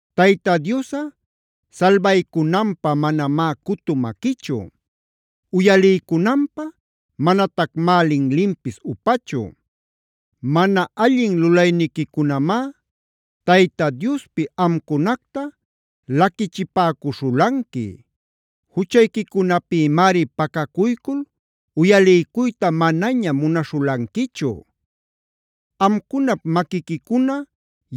Tayta Diosꞌa salbaycunanpä manamá cutu maquichu; uyaliycunanpä manatacmá linlinpis upachu. Mana allin lulayniquicunamá Tayta Diospi amcunacta laquichipäcuśhulanqui. Juchayquicunapïmari pacacuycul uyaliycuyta manaña munaśhulanquichu. Amcunap maquiquicuna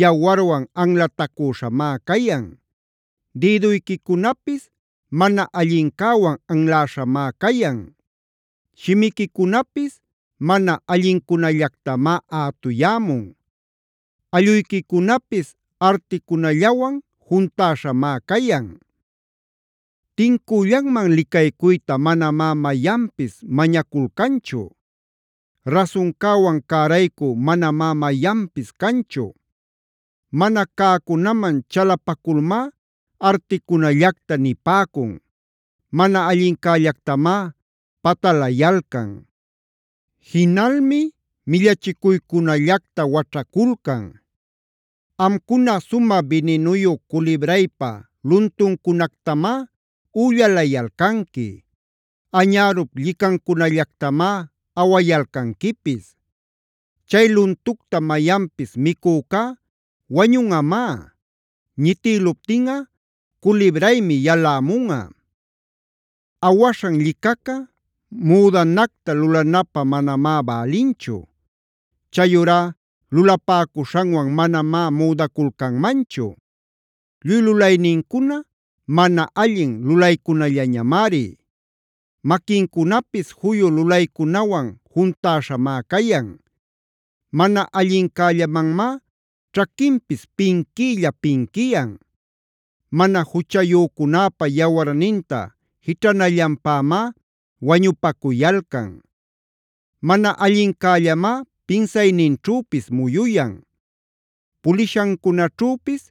yawarwan anlatacüśhamá cayan. Dïduyquicunapis mana allincäwan anläśhamá cayan. Shimiquicunapis mana allincunallactamá ätuyämun; alluyquicunapis articunallawan juntäśhamá cayan. Tincüllanman licaycuyta manamá mayanpis mañaculcanchu; rasuncäwan cäraycü manamá mayanpis canchu. Mana cäcunaman chalapaculmá articunallacta nipäcun. Mana allincällactamá patalayalcan; jinalmi millachicuycunallacta waćhaculcan. Amcuna sumä bininuyu culibraypa luntuncunactamá üllalayalcanqui; añärup llicancunallactamá awayalcanquipis. Chay luntucta mayanpis micücá wañunꞌamá; ñitïluptinꞌa culibraymi yalämunꞌa. Awaśhan llicaca müdanacta lulanapä manamá bälinchu. Chayurá lulapäcuśhanwan manamá müdaculcanmanchu. Lluy lulaynincuna mana allin lulaycunallamari; maquincunapis juyu lulaycunawan juntäśhamá cayan. Mana allincällamanmá ćhaquinpis pinquiylla pinquiyan; mana juchayücunäpa yawarninta jićhanallanpämá wañupacuyalcan. Mana allincällamá pinsayninćhüpis muyuyan; pulishancunaćhüpis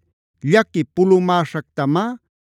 llaqui pulumäśhactamá,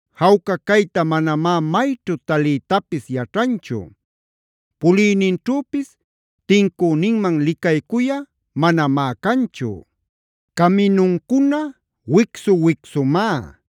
Jawca cayta manamá mayćhu taliytapis yaćhanchu. Puliyninćhüpis tincüninman licaycuyꞌa manamá canchu. Caminuncuna wicsu-wicsumá;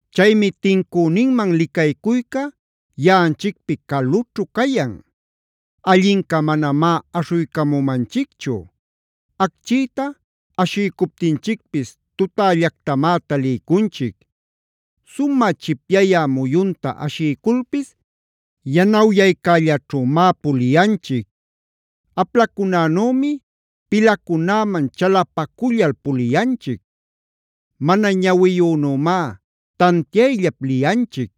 Chaymi tincüninman licaycuyca yaꞌanchicpi calućhu cayan; allinca manamá aśhuycamumanchicchu. Acchïta ashiycuptinchicpis tutällactamá taliycunchic. Sumä chipyayä muyunta ashiyculpis yanawyaycällaćhümá puliyanchic. Aplacunänümi pilacunäman chalapacullal puliyanchic; mana ñawiyünümá tantiayllap liyanchic.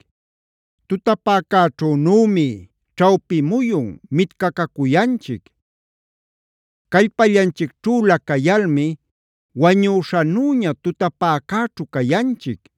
Tutapäcäćhünümi ćhawpi muyun mitcacacuyanchic. Callpallanchicćhülä cayalmi wañüśhanüña tutapäcäćhu cayanchic.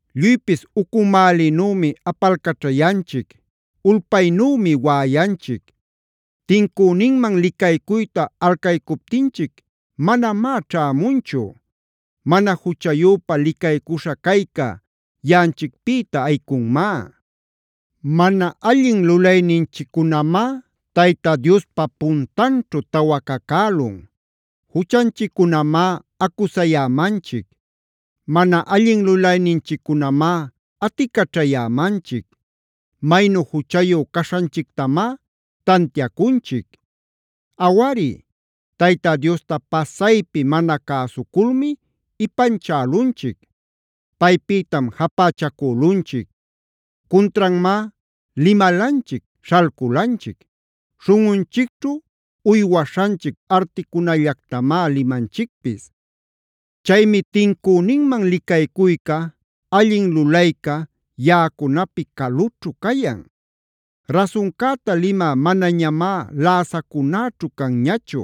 Lluypis ucumälinümi apalcaćhayanchic; ulpaynümi waꞌayanchic. Tincüninman licaycuyta alcaycuptinchic manamá ćhämunchu. Mana juchayüpa licaycuśha cayca yaꞌanchicpïta ayicunmá. Mana allin lulayninchiccunamá Tayta Diospa puntanćhu tawacacälun. Juchanchiccunamá acusayämanchic. Mana allin lulayninchiccunamá aticaćhayämanchic; maynu juchayu caśhanchictamá tantiacunchic. Awari, Tayta Diosta pasaypi mana cäsuculmi ipanchälunchic; paypïtam japächacülunchic. Cuntranmá limalanchic, śhalculanchic. Śhunꞌunchicćhu uywaśhanchic articunallactamá limanchicpis. Chaymi tincüninman licaycuyca, allin lulayca yaꞌacunapi calućhu cayan. Rasuncäta limä manañamá läsacunäćhu canñachu.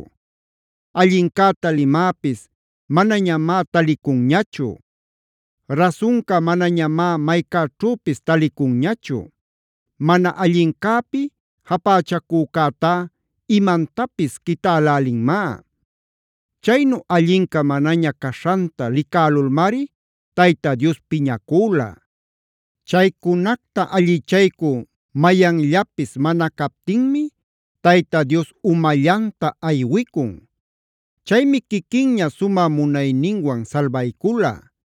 Allincäta limäpis manañamá talicunñachu. Rasunca manañamá maycäćhüpis talicunñachu. Mana allincäpi japächacücätá imantapis quitälälinmá. Chaynu allinca manaña caśhanta licälulmari Tayta Dios piñacüla. Chaycunacta allichaycü mayanllapis mana captinmi Tayta Dios umallanta aywicun. Chaymi quiquinña sumä munayninwan salbaycula;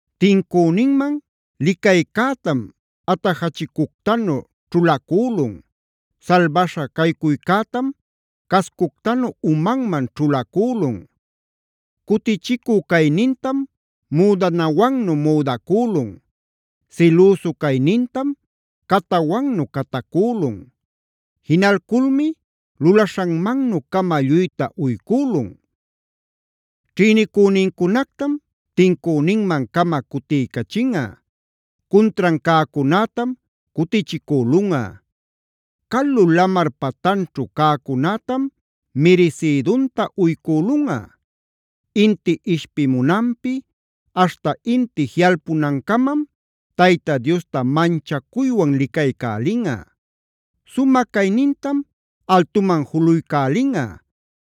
Tincüninman licaycätam atajachicuctanu ćhulacülun. Salbaśha caycuycätam cascuctanu umanman ćhulacülun.d Cutichicü caynintam müdanawannu müdacülun. Silüsu caynintam catawannu catacülun. Jinaculculmi lulaśhanmannu-cama lluyta uycülunꞌa. Ćhïnicünincunactam tincüninman-cama cutiycachinꞌa. Cuntran cäcunätam cutichicülunꞌa; calu lamar patanćhu cäcunätam mirisïdunta uycülunꞌa. Inti ishpimunanpi aśhta inti jiꞌalpunancamam Tayta Diosta manchacuywan licaycälinꞌa; sumä caynintam altuman juluycälinꞌa.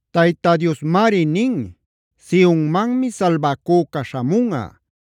Tayta Diosmari nin: “Sionmanmi salbacüca śhamunꞌa;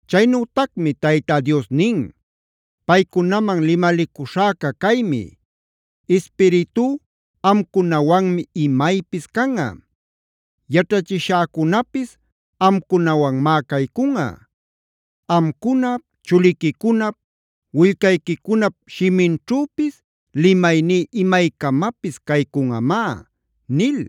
Chaynütacmi Tayta Dios nin: “Paycunaman limalicuśhäca caymi: Ispiritú amcunawanmi imaypis canꞌa; yaćhachishäcunapis amcunawanmá caycunꞌa. Amcunap, chuliquicunap, willcayquicunap shiminćhüpis limayní imaycamapis caycunꞌamá” nil.